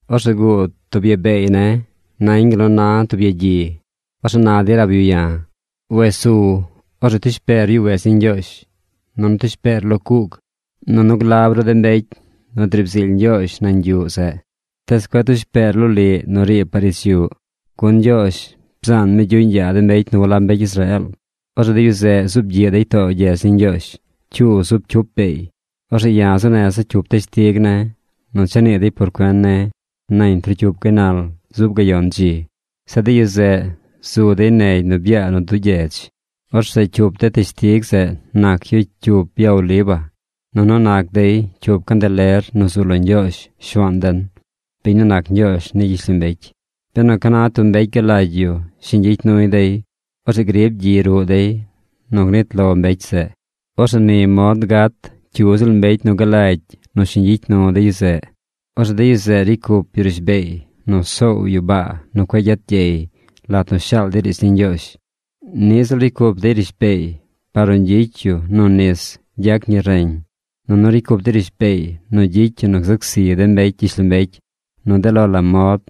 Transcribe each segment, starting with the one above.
Orzeꞌ guud tub ya beey ne̱ nañ gal nu na tub yagyi. Orzeꞌ na dey rab yu ya̱: ―Wes su. Orzeꞌ tush peer yuꞌ wedz ni Ñgyoozh. Nunu tush peer lo cuug. Nunu glab ru de mbecy nu driib zily Ñgyoozh nañ yuꞌ zeꞌ. Tees cueꞌ tush peer loliꞌ nu riib par ich yuꞌ, gun Ñgyoozh bzaan mi gyuꞌñ yaa de mbecy nu walab mbecy Israeel. Orzeꞌ de yu zeꞌ zub gyiꞌ dey too gyedz ni Ñgyoozh cyuu zub cyup beey. Orzeꞌ ya̱ zuu neza̱ cyup teshtig ne̱ nu cha nii dey por cuen ne̱ nañ trocyup gaynal zub gayon dzi. Zeꞌ de yu zeꞌ zu dey negy nu byaa nu duu gyedz. ’Orzeꞌ cyup de teshtig zeꞌ nac yu cyup ya oliva, nunu nac dey cyup candeler nu zu lo Ñgyoozh Shuaan den, biñ nu nac Ñgyoozh ni gyishlombecy. Benu ca na tub mbecy galagy yu shiñ gyicy nuy dey, orzeꞌ grib gyi ruꞌ dey nu gnit lo mbecy zeꞌ. Orzeꞌ ni mod gat cyu ziꞌl mbecy nu galagy nu shiñ gyicy nu de yu zeꞌ. Orzeꞌ de yu zeꞌ ricy cup yu rishbeey nu soow yu baa nu cueꞌ gyet gyey lat nu shaal dey riidz ni Ñgyoozh. Niꞌ ziꞌl ricy cup dey rishbeey par nu gyicy yu nu nis gyac ñi reñ. Nunu ricy cup dey rishbeey nu gyicy yu nu gzac zi de mbecy gyishlombecy nu de lo la mod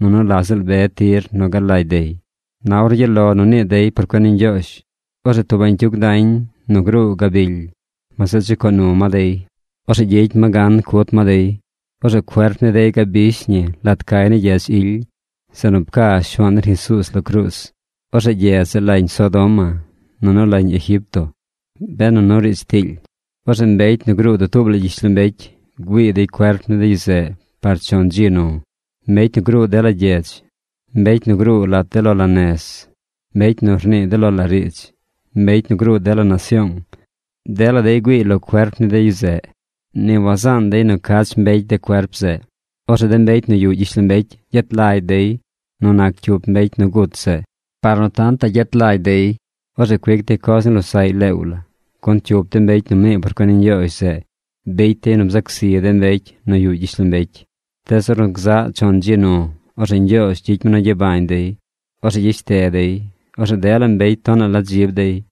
nunu la ziꞌl be tir nu galagy dey. Na ornu gyaꞌ lo nu nii dey por cuen ni Ñgyoozh, orzeꞌ tub bañcyug dañ nu gruu gabily, ma zeꞌ chucoo nu ma dey. Orzeꞌ gyicy ma gan cut ma dey. Orzeꞌ cuerp ni dey gabish ñi lat cay ni gyedz ily, zeꞌ nu pca Shuaan den Jesuuz lo cruuz. Orzeꞌ gyedz zeꞌ lañ Sodoma, nunu lañ Egipto, benu nu riidz tiily. Orzeꞌ mbecy nu gruu dutuub la gyishlombecy, güii dey cuerp ni de yu zeꞌ par chon dzi nu. Mbecy nu gruu dela gyedz, mbecy nu gruu lat de lo la nez, mbecy nu rnii de lo la riidz, mbecy nu gruu dela nasyoong, dela dey güiiy lo cuerp ni de yu zeꞌ. Ni wazaan dey nu cach mbecy de cuerp zeꞌ. ’Orzeꞌ de mbecy nu yuꞌ gyishlombecy gyet lagy dey nu nac cyup mbecy nu gut zeꞌ. Par nu tantaꞌ yet lagy dey, orzeꞌ cuic dey coz ni losaꞌy leew la. Gun cyup de mbecy nu mnii por cuen ni Ñgyoozh zeꞌ bicy dey nu bzac zi de mbecy nu yuꞌ gyishlombecy. Tees ornu gzaꞌ chon dzi nu, orzeꞌ Ñgyoozh gyicy mi nu gyabañ dey. Orzeꞌ gyeshte dey. Orzeꞌ dela mbecy tonaꞌ la dzib dey.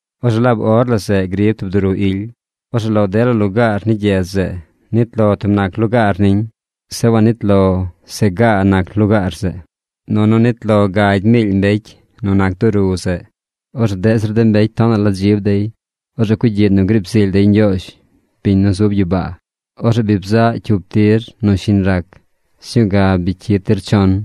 Orzeꞌ laab or la zeꞌ griib tub duru ily. Orzeꞌ lo dela lugaar ni gyedz zeꞌ, nit lo tub nac lugaar niñ. Zeꞌ wanit lo se gaa nac lugaar zeꞌ. Nunu nit lo gagy miily mbecy nu nac duru zeꞌ. Orzeꞌ deꞌ zir de mbecy tonaꞌ la dzib dey. Orzeꞌ cugyiꞌ nu griib zily dey Ñgyoozh, biñ nu zub gyibaa. Orzeꞌ bi bzaꞌ cyup tir nu shiñ rac. Sñuu ga bi cyid tir chon.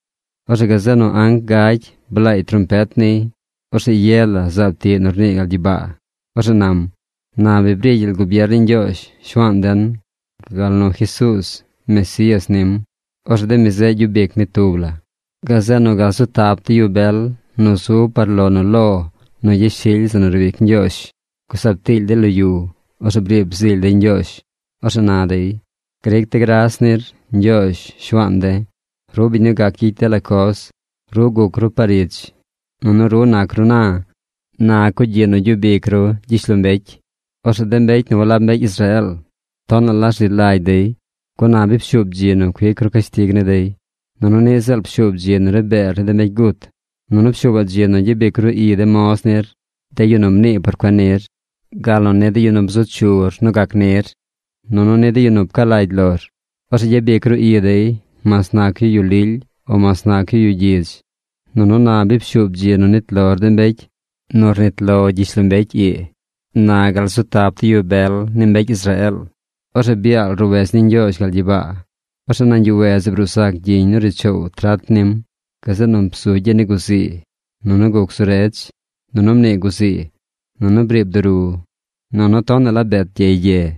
Orzeꞌ gazeꞌ nu anc gagy blaay trompet niy. Orzeꞌ ye la zaab tiꞌ nu rnii gal gyibaa. Orzeꞌ nam: Na bi bri gyel gubier ni Ñgyoozh, Shuaan den, gal nu Jesuuz, Mesías nim. Orzeꞌ de mi zeꞌ gyub ic mi tub la. Gazeꞌ nu gal zu tap de yu bel nu zub par lo nu lo nu yashily zeꞌ nu riib ic Ñgyoozh, gusab tiily dey lo yu. Orzeꞌ briib zily dey Ñgyoozh. Orzeꞌ na dey: Gric de̱ gras nir, Ñgyoozh, Shuaan de̱. Ru biñ nu gac gyicy dela coz. Ru guc ru par ich, nunu ru nac ru na. Na cugyiꞌ nu gyub ic ru gyishlombecy. Orzeꞌ de mbecy nu walab mbecy Israeel tonaꞌ la rzi lagy dey, gun na bi pshuub dzi nu cuic ru cashtig ni dey. Nunu niꞌ ziꞌl pshuub dzi nu ri beer ni de mbecy gut. Nunu pshuubaꞌ dzi nu gyabic ru i de moz nir, de yu nu mnii por cuen nir, gal nu ni de yu nu bzu chu nu gac nir, nunu ni de yu nu pca lagy lor. Orzeꞌ gyabic ru i dey mas nac yu yu lily o mas nac yu yu gyidz. Nunu na bi pshuub dzi nu nit lor de mbecy nu rnit lo gyishlombecy ii, na gal zu tap de yu bel ni mbecy Israeel. Orzeꞌ byaal roꞌ wedz ni Ñgyoozh gal gyibaa. Orzeꞌ nañ yuꞌ wedz zeꞌ bruu zac gyiñ nu ri choow trat nim. Gazeꞌ nu bzu gyi ni guzii, nunu guc zu redz, nunu mnii guzii, nunu briib duru, nunu tonaꞌ la bet gyey gye.